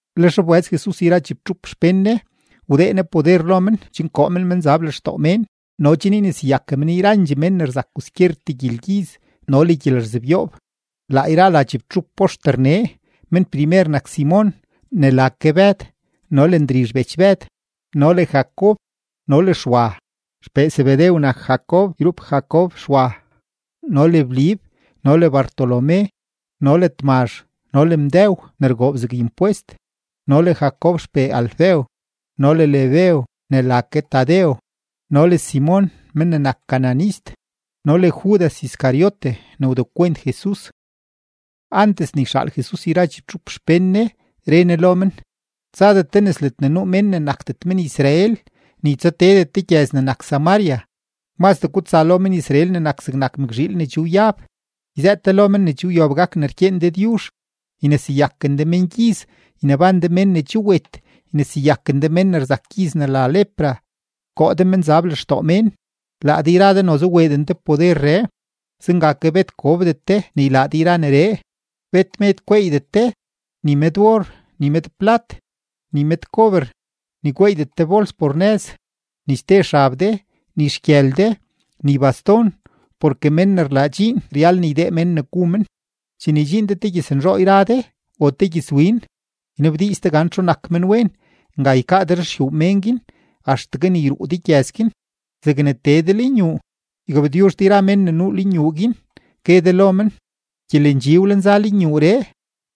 Lex wbëz Jesus yra chibtxup xpén Ne, wdee Ne poder lo men chen koo men menzab lextoo mén no chen yneseyaken men yrandxee mén ne rzak kwaskyertee gyelgyiz no le gyelerzebyoob. Laa yra la chibtxup poxter nee: mén primer nak Simon ne la ke Bëd, no le Ndrizh bech Bëd, no le Jacob no le Xwa (Xpee Zebedew nak Jacob yrup Jacob Xwa.), no le Blib, no le Bartolomé, no le Tmazh, no le Mdëw ne rgoob zeg impwest, no le Jacob xpee Alfeo, no le Lebeo ne la ke Tadeo, no le Simon men ne nak cananist, no le Judas Iscariote ne wdekwent Jesus. Antes ne yxaal Jesus yra chibtxup xpén Ne, re Ne lo men: ―Tsadet de nes ledne nuu mén ne nakdet men-Israel, ni tsateedet de gyëz ne nak Samaria; mazdee gutsa lo men-Israel ne nak zegnak mëkzhiil ne che wyab, yzëët de lo men ne che wyob gak ne rkyeen Dëdyuzh. Yneseyaken de mengyiz, yneban de mén ne che wet, yneseyaken de mén ne rzak gyiz ne la lepra, koo de menzab lextoo mén. Laa de yra de noze weeden de poderree, zenga ke bet gobdet de ne ylaa de yra neree. ’Bet med gweeydet de, ni med or, ni med plat, ni med kober, ni gweeydet de bols por nëz, ni ste xab de, ni xgyël de, ni baston. Porke mén ne rlaa dxiin ryal ne ydee mén ne gu men. ’Chene ydxiin de te gyëznzhoo yra de o te gyëzwin, ynabdiiz de gan txu nak men wen, nga ykaa de ruxyuu mén guin axtegue ne yruu de gyëz guin. Zegne tee de lenyuu, ygabtyuzh de yra mén ne nuu yuu guin, gue de lo men: “Gyelendxi wlenza lenyuuree.”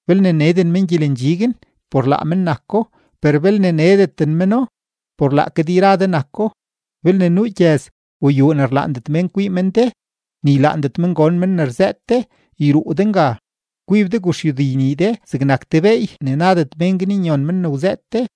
Belne neden men gyelendxi guin, por laa men nako, per belne nedendet meno, por laake de yra de nako. Belne nuu gyëz o yuu ne ylaandet mén kwii men de ni ylaandet men gon men ne rzëët de, yruu de nga, kwib de guxyudi nii de zegnak te beey ne nadet mén guin nyon men ne wzëët de.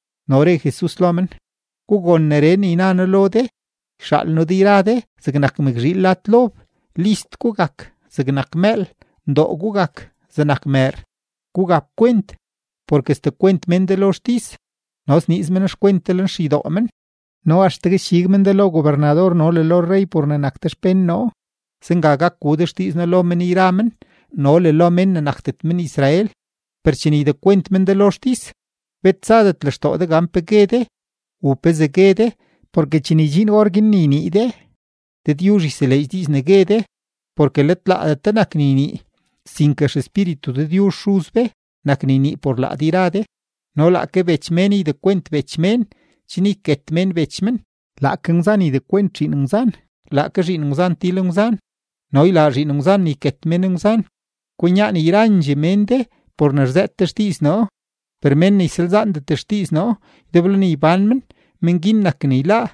No re Jesus lo men: ―Gugon neree ne yna noo lo de, yxaal noo de yra de zegnak mëkzhiil lad lob. List gugak zegnak mëël, ndoo gugak zegnak mëër. Gugap kwent porke sdekwent mén de lo xtis, no sniiz men xkwent de lenxeydoo men. No axtegue sdxig men de lo gobernador no le lo rrey por ne nak de xpén noo, zenga gak gu de xdiiz noo lo men yra men no le lo mén ne nakdet men-Israel. Per chene ydekwent men de lo xtis, bet tsadet lextoo de gan pe gue de o pezee gue de, porke chene ydxiin orguin ne ynii de, Dëdyuzh yseleedx diiz ne gue de. Porke let laadet de nak ne ynii, sinke XEspíritu Dëdyuzh Xuz be nak ne ynii por laa de yra de. ’No laake bech mén ydekwent bech mén chen yket mén bech men, laake ngwzan ydekwent zhiin ngwzan, laake zhiin ngwzan til ngwzan no ylaa zhiin ngwzan ne yket mén ngwzan. Kwinyaan yrandxee mén de por ne rzëët de xdiiz noo, per men ne ysalzaandet xdiiz noo ydeblo ne ybán men, men guin nak ne yláá.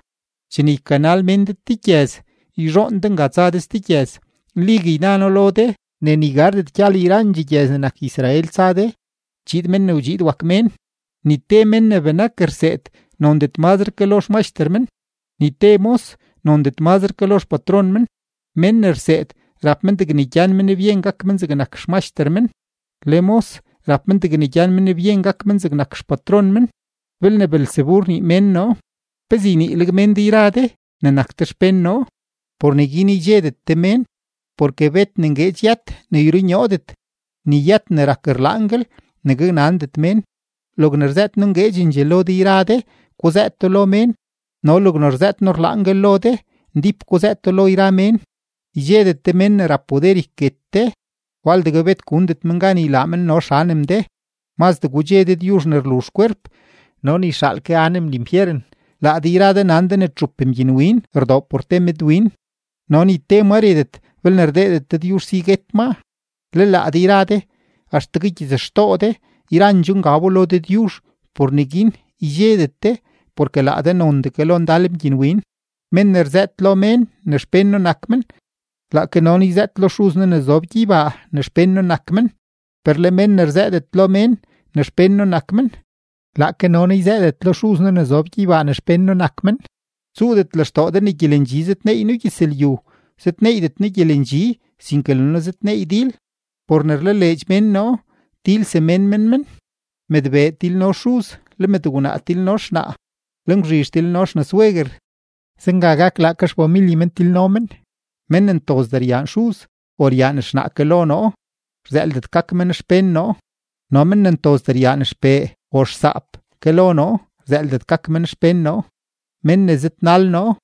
Chene ykanal mén de te gyëz, yzhoon de nga tsa de ste gyëz. Nligue yna noo lo de ne ni gardet gyal yrandxee gyëz ne nak Israel tsa de, chiid Men ne wdxiid wak Mén. ’Ni te mén ne benak rseed nondet mazre ke lo xmaxter men; ni te mos nondet mazre ke lo xpatron men. Men ne rseed rap men degne gyan men byen gak men zegnak xmaxter men, le mos rap men degne gyan men byen gak men zegnak xpatron men. Belne Beelzebu rnii mén noo, ¿pezee yniileg mén de yra de ne nak de xpén noo? ’Por neguin ydxedet de mén. Porke bet ne ngueedx yët ne yrunyoodet, ni yët ne rak rlaanguel ne gaknandet mén. Logne rzëët noo ngueedxendxee lo de yra de, guzëëto lo mén, no logne rzëët noo rlaanguel lo de, ndíp guzëëto lo yra mén. Ydxedet de mén ne rap poder yket de, waldegue bet gundet men gan ylaa men no xanem de. Mazdee gudxe Dëdyuzh ne rluzh kwerp no ne yxaal ke anem linfyeren. ’Laa de yra de nan de ne txup mgyinwin rdoo por te medwin, no ni te ma retet belne rdeedet Dëdyuzh si ne guet maa. Le laa de yra de, axtegue gyitsxtoo de yrandxoo ngab lo Dëdyuzh. Por neguin ydxedet de, porke laa de nondee ke lo ndal mgyinwin. ’Mén ne rzëët lo mén ne xpén noo nak men, laake no noo yzëët lo Xuz noo ne zob gyeybaa ne xpén noo nak men. Per le mén ne rzëëdet lo mén ne xpén noo nak men, laake no noo yzëëdet lo Xuz noo ne zob gyeybaa ne xpén noo nak men. ’Tsuudet lextoo de ne gyelendxi zëdneey noo gyëzlyu; zëdneeydet noo gyelendxi, sinke le noo zëdneey dil. Por ne rlaleedx mén noo, til semén men men: mëdbee tilno xuz, le mëdgwnaa tilno xnaa, le ngwzhizh tilno xnasweguer. Zenga gak, laake xfamilye men tilno men. ’Men ne ntozdee ryaan xuz o ryaan xnaa ke lo noo, rzëëldet gak men xpén noo; no men ne ntozdee ryaan xpee o xsaap ke lo noo, rzëëldet gak men xpén noo. Men ne zëdnal noo,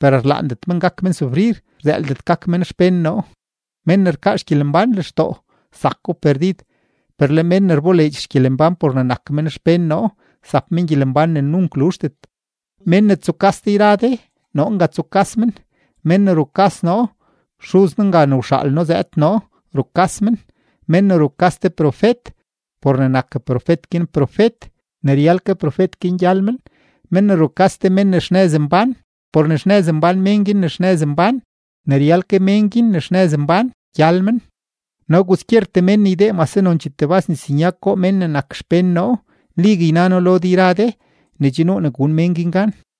per rlaandet men gak men sufrir, rzëëldet gak men xpén noo. Men ne rkaa xgyelembán lextoo, zako perdid; per le men ne rboleedx xgyelembán por ne nak men xpén noo, zap men gyelembán ne nunk luzhdet. ’Men ne tsukas de yra de, noo nga tsukas men; men ne rukas noo, Xuz noo nga ne wxaal noo zëëd noo rukas men. Men ne rukas te profet por ne nak profet guin profet, ne ryal ke profet guin gyal men; men ne rukas te men ne xnëz mbán por ne xnëz mbán men guin ne xnëz mbán, ne ryal ke men guin ne xnëz mbán gyal men. No kwaskyertee mén ne ydee mase nonchee tebas nisnyag goo men ne nak xpén noo, nligue yna noo lo de yra de ne che nuu ne gun mén guin gan.